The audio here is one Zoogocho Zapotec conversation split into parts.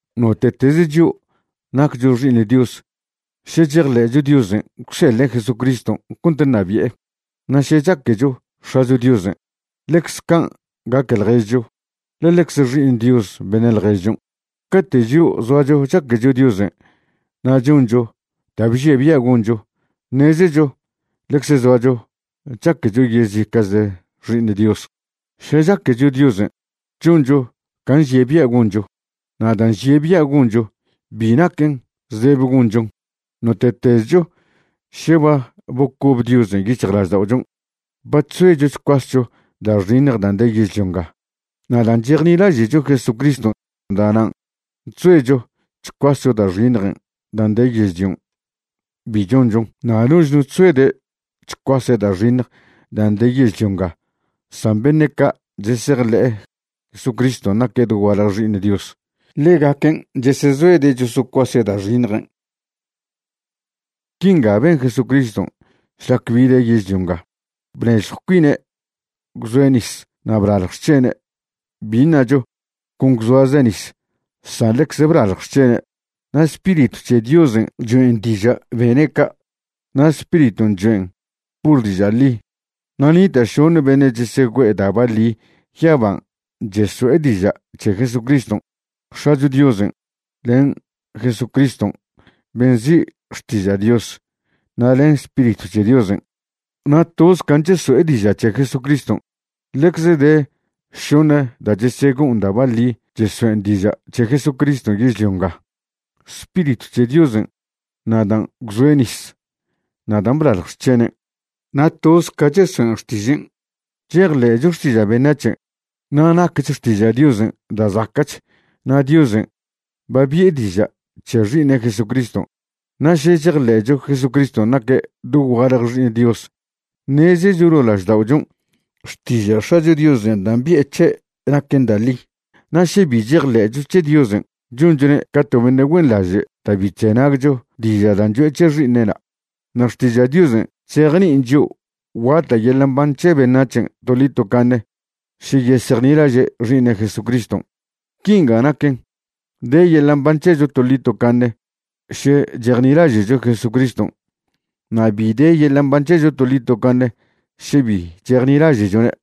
Note'tez chio' naccho xi'iṉ Dios še chejḻe'cho Diosen' gwseḻe' Jesucriston' cont nabi'e. Na' še chaquecho X̱acho Diosen', ḻecz can' gaque ḻježcho, ḻe ḻecz xi'iṉ Dios beṉe' ḻježchon'. Cate' chio' zoacho chaquecho Diosen' na' choncho da' bžie' bia' goncho, ṉezecho ḻecze zoacho chaquecho yezica'chle xi'iṉ Dios. Še chaquecho Diosen', choncho can' nžie' bia' goncho. Na' dan' nžie' bia' goncho, bi naquen zdebe gonchon. Note'tezcho še ba bocob Diosen' yic̱hjlažda'ochon', ba chzoecho chcuascho da' xiṉj dan' de yežlio nga. Na' dan' chejnilaže'cho Jesucriston', da'nan' chzoecho chcuascho da' xiṉjen' dan' de yežlion' bi chonchon. Na' noch no chzoede' chcuase' da' xiṉj dan' de yežlio nga san beṉe' ca' chesejḻe'e Jesucriston' naque' dogualje Xi'iṉ Dios, ḻegaquen' chesezoede' chosocuase' da' xiṉjen'. Quinga ben Jesucriston' šlac bide' yežlio nga, bnežjw cuine' gwzoe' nis na' blalj xc̱hene'. Bi ṉacho con gwzoaze' nis, san ḻecz blalj xc̱hene'. Na' Spiritw c̱he Diosen' choen' diža' bene' ca', na' Spiriton' choen' pur diža' ḻi. Na' nita' šoṉe beṉe' chesegüe'e da' baḻi yaban' cheso'e diža' c̱he Jesucriston': X̱acho Diosen', len Jesucriston' ben' nzi' Xtiža' Dios na' len Spiritw c̱he Diosen'. Na' toz can' cheso'e diža' c̱he Jesucriston'. Ḻecz de šoṉe da' chesego'on da' baḻi chesoen' diža' c̱he Jesucriston' yežlio nga: Spiritw c̱he Diosen', na' dan' gwzoe' nis na' dan' blalj xc̱henen'. Na' toz ca chesoen' xtižen'. Chejḻe'cho xtiža' beṉac̱hen', na' nacch xtiža' Diosen' da' zaca'ch, na' Diosen' ba bi'e diža' c̱he Xi'iṉe' Jesucriston'. Na' še chejḻe'cho Jesucriston' naque' dogualje Xi'iṉ Dios, ṉezecho ḻo' lažda'ochon' xtiža' X̱acho Diosen' dan' bi'e c̱he' naquen da' ḻi. Na' še bi chejḻe'cho c̱he Diosen', chonchone' ca to beṉe' güenḻaže' da' bi chzenagcho diža' dan' cho'e c̱he Xi'iṉe'na'. Na' xtiža' Diosen' chzejni'in chio' guata' yeḻa' mban c̱he beṉac̱hen' toḻi tocaṉe še yesejnilaže' Xi'iṉe' Jesucriston'. Quinga naquen, de yeḻa' mban c̱hecho toḻi tocaṉe še chejnilaže'cho Jesucriston', na' bi de yeḻa' mban c̱hecho toḻi tocaṉe še bi chejnilaže'chone'.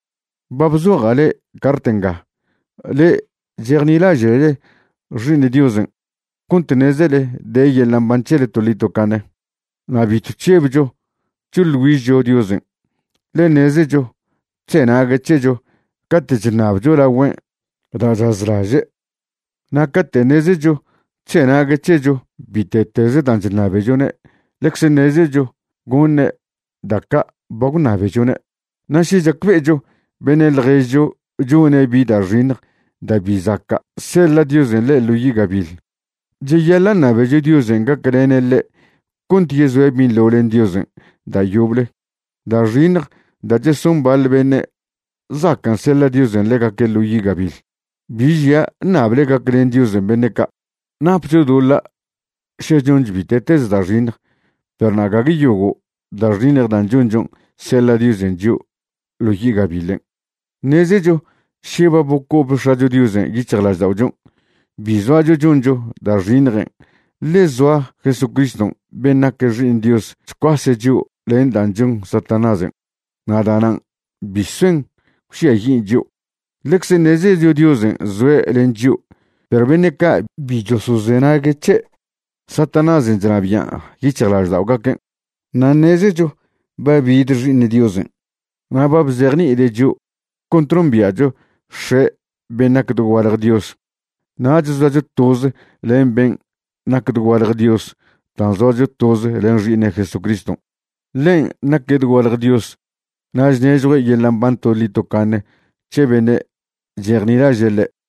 Ba bzoja' le'e cart nga, le'e chejnilaže'le Xi'iṉ Diosen', cont ṉezele de yeḻa' mban c̱hele toḻi tocaṉe. Na' bitw chžebcho choḻ güižcho Diosen', ḻe ṉezecho chzenague' c̱hecho cate' chṉabcho lagüen' da' chazlaže'. Na' cate' ṉezecho chzenague' c̱hecho bite'tez dan' chṉabechone', ḻecz ṉezecho goṉe' da' ca' ba gwṉabechone'. Na' še chacbe'echo beṉe' ḻježcho chone' bi da' xiṉj da' bi zaca' seḻa' Diosen' ḻe' ḻo yi' gabiḻ, cheyaḻa' ṉabecho Diosen' gaclene' ḻe' cont yezoe' binḻo len Diosen' da' yoble. Da' xiṉj da' cheson baḻ beṉe' zacan' seḻa' Diosen' ḻegaque' ḻo yi' gabiḻ. Bi žia' ṉable gaclen Diosen' beṉe' ca'. Napcho doḻa' še choncho bite'tez da' xiṉj, perw gague yogo' da' xiṉj dan' chonchon' seḻa' Diosen' chio' ḻo yi' gabiḻen'. Ṉezecho še ba bocob X̱acho Diosen' yic̱hjlažda'ochon' bi zoacho choncho da' xiṉjen' ḻe zoa Jesucriston' ben' nac Xi'iṉ Diosen' chcuase' chio' len dan' chon Satanásen', na' da'nan' bi soen gwžiayin' chio'. Ḻecz ṉezecho Diosen' zoe' len chio', perw beṉe' ca' bi chosozenague' c̱he', Satanásen' chnabian' yic̱hjlažda'ogaquen'. Na' ṉezecho ba bid Xi'iṉ Diosen', na' ba bzejni'ide' chio' cont nombia'cho X̱e' ben' nac dogualje Dios. Nach zoacho toz len ben' nac dogualje Dios dan' zoacho toz len Xi'iṉe' Jesucriston'. Ḻen' naque' dogualje Dios na' chnežjue' yeḻa' mban toḻi tocaṉe c̱he beṉe' chejnilaže' ḻe'.